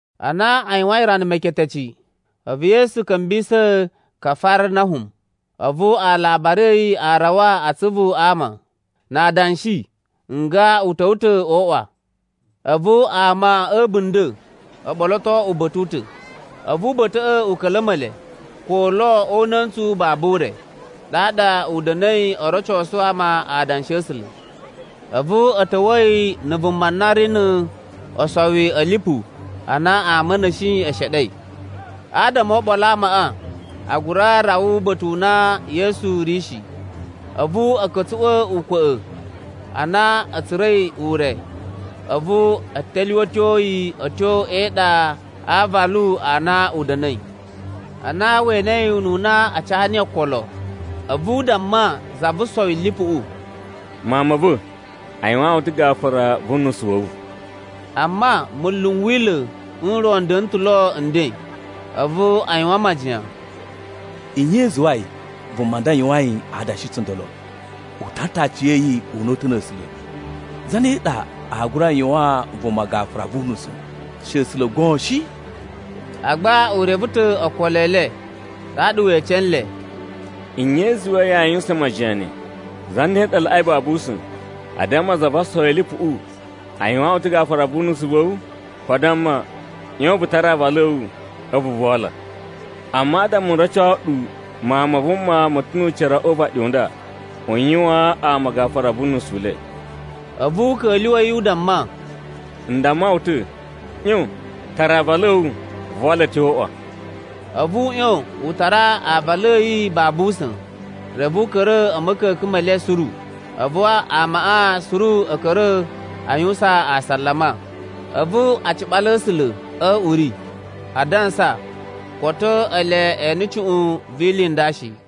Ana a yuwain rana meketeci, a̱vu Yesu ka̱mbisa̱ Kafarnahum. A̱vu alabari a̱ yi a rawa a atsuvu a ama, na adanshi nga u ta̱wa̱ ta̱ o uꞌwa. A̱vu ama a̱ a̱bunda̱ o ɓoloto uba̱ta̱ u ta̱, a̱vu uba̱ta̱ꞌa̱ u ka̱la̱ma̱ le, ko lo o una̱ntsu babu ure, ɗaɗa u da̱na̱i o rocosu ama Adanshi a̱ A̱sula̱. A̱vu a̱ ta̱wa̱a̱ yi na̱ vuma na ri no osowi a̱ lipu a na ama a̱ na̱shi e sheɗei. Adama o oɓolo a amaꞌa, a gura rawa uba̱ta̱ u na Yesu ri shi, a̱vu a̱ ka̱tsuꞌwa̱ ukwa̱ꞌa̱. Ana a̱ tsura̱i ure, a̱vu a̱ telyuwetyo yi a̱ tyo e iɗa a aavalu a na u da̱na̱i. Ana we enei ununa a ca niyi okolo, a̱vu u damma za vo osowi a̱ lipuꞌu, “Mawun ma̱ va̱, a yuwaan wu ta̱ gafura vu unusu wa̱ wu.” Amma munlu n Wila̱ n ro n da̱na̱ ta̱ lo nden, a̱vu a yuwan majiyan, “Nye i zuwai vuma nda yuwain adanshi tsundolo? U tara ta̱ aciya̱yi una̱ta̱ na̱ A̱sula̱. Zane ɗa aa gura yuwaan vuma gafura vu unusu, she A̱sula̱ goon shi?” Agba u reve ta̱ okolo e le, ɗaɗa we ece nle, “Nye i zuwai yaa yuwusan majiyan ne? Zane ɗa laꞌai babu usa̱n: a damma za vo osowi a̱ lipuꞌu, ‘A yuwaan wu ta̱ gafura wu unusu wa̱ wu,’ ko a damma, ‘ꞌYon, vu tara aavalu a̱ wu, a̱vu vu wala’? Amma adama n roco ɗu Mawun ma Vuma ma̱ ta̱ nu ucira o uvaɗi nda u yuwaan ama gafura vu unusu u le,” a̱vu u ka̱lyuwa̱ yi u damma, “N damma wu ta̱, ꞌyon, tara aavalu a̱ wu, vu wala a̱ tyo o uꞌwa.” A̱vu u ꞌyon u tara aavalu a̱ yi babu usa̱n. Reve u ka̱ra̱ a̱ ma̱ka̱ka̱n me le suru. A̱vu amaꞌa suru a̱ ka̱ra̱ a yuwusan asalama. A̱vu a ciɓala A̱sula̱ a̱ uri a dansa koto ele e ene cuꞌun vi ili i nda shi.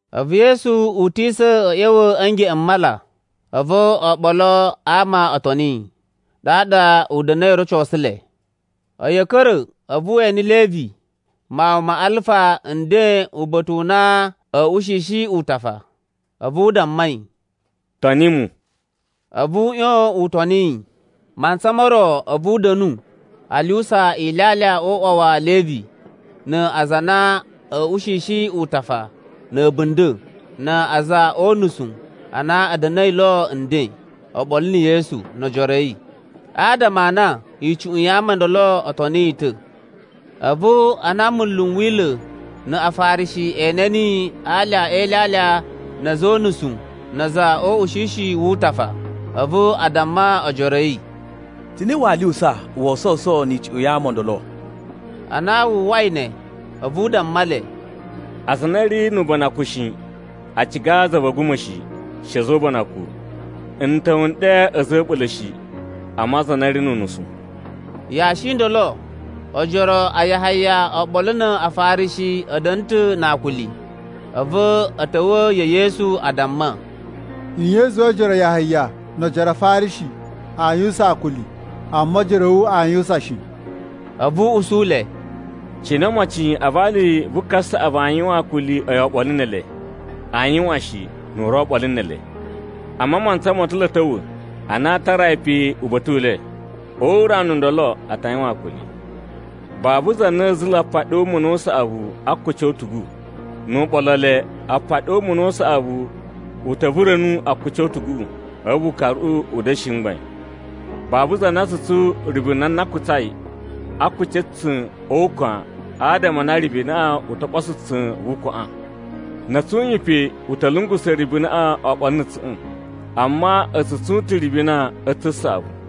A̱vu Yesu utisa̱ a̱ ꞌya̱wa̱ a̱ ngeꞌen m mala, a̱vu oɓolo a ama o toni yi, ɗaɗa u da̱na̱i o rocosu le. A̱yi a̱ ka̱ra̱, a̱vu we ene Levi, mawun ma Alfa nden uba̱ta̱ u na a̱a̱ ushishi utafa, a̱vu u damma yi, “Toni mu.” A̱vu u ꞌyon u toni yi. Mantsa mo ro a̱vu u da̱nu a lyuwusa ilyalya o uꞌwa wa̱ Levi na aza a na a̱a̱ ushishi utafa na̱ a̱bunda̱ na̱ a̱za̱ o unusu a na a̱ da̱na̱i lo nden oɓolo na̱ Yesu no ojoro a̱ yi, adama a na icuꞌun ya ama o ndolo o toni yi ta̱. A̱vu ana munlu n Wila̱ na Afarishi e ene niyi a alya e ilyalya na̱ a̱za̱ o unusu na̱ a̱za̱ o ushishi wu utafa, a̱vu a damma ojoro a̱ yi, “Cine waa lyuwusa woo sowuso ni icuꞌun ya ama o ndolo?” Ana wu uwwai ne, a̱vu u damma le, “Aza a na a̱ ri nu ubanakun shi, a ciga za va̱ a̱guma̱ shi, she a̱za̱ o ubanakun. N ta̱wa̱ n ɗe a̱za̱ a̱ a̱ɓula̱ shi, amma aza a na a̱ ri nu unusu.” Yashi i ndolo ojoro a Yahaya oɓolo na Afarishi a̱ da̱na̱ ta̱ na akuli, a̱vu a̱ ta̱wa̱ ya̱ Yesu a damma, “Nye i zuwai ojoro a Yahaya no ojoro a Afarishi aa yuwusan akuli, amma ojoro a̱ wu aa yuwusan shi?” A̱vu u usu le, “Cine omocin a vali vu kasaꞌavu aa yuwan akuli a̱yi oɓolo ne ele? Aa yuwan shi, nu u ri lo oɓolo ne ele. Amma mantsa mo ta̱ lo a̱ ta̱wa̱ ana aa tara yi pe uba̱ta̱ u le. O urana u ndolo, a ta yuwan akuli. “Babu za na a̱ zula̱ apaɗi o umuna u saꞌavu a akuci o utugu. Nu u ɓolo le, apaɗi o umuna u saꞌavuꞌu u ta̱ vura̱nu akuci o utuguꞌu, a̱vu ukaruꞌu u da̱shi mgbain. Babu za na tsu tsun ribina na kutsai a akuci a̱ tsa̱n o ukwan adama a na ribinaꞌa u to ɓoso tsa̱n vu ukwaꞌan, na̱ a̱ tsun yi pe u ta̱ lungusa̱ ribinaꞌa oɓolo na̱ tsa̱ꞌa̱n. Amma a̱ tsu tsun ta̱ ribina a̱ tsa̱n saꞌavu.”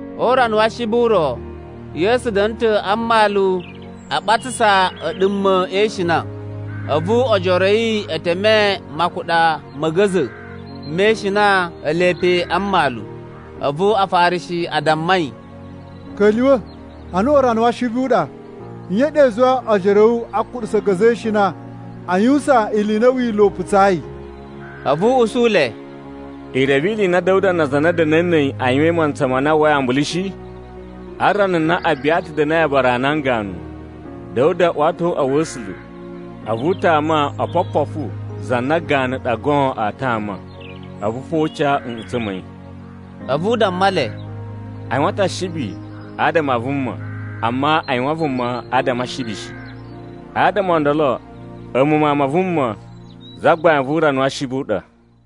O urana wa Ashibi u ro, Yesu da̱na̱ ta̱ a mmalu a ɓatsasa a̱ a̱ɗuma̱ e ishina, a̱vu ojoro a̱ yi e teme makuɗa ma̱ a̱ga̱za̱ me ishina ele pe a mmalu. A̱vu Afarishi a damma yi, “Ka̱lyuwa̱, anaꞌan urana wa Ashibi u ɗa. Nye i ɗa i zuwai ojoro a̱ wu a kuɗusa a̱ga̱za̱ e ishina a yuwusan ili i na Wila̱ u putsayi?” A̱vu u usu le, “I reve ili i na Da̱wuda na aza a na a̱ da̱na̱i na̱ a̱yi a yuwain mantsa ma na a uwwai ambulu shi? A rana na Abiyata da̱na̱i aabara a nan ganu, Da̱wuda uwa ta̱ o uꞌwa wa̱ A̱sula̱, a̱vu u tama opopofu za na ganu ɗa goon aa tama. A̱vu fo u ca nꞌutsa̱ ma̱ yi.” A̱vu u damma le, “A yuwan ta̱ Ashibi adama a vuma, amma a yuwan vuma adama a Ashibi shi. Adama o ndolo, a̱mu Mawun ma Vuma, Zagbain vu urana wa Ashibi a ɗa.”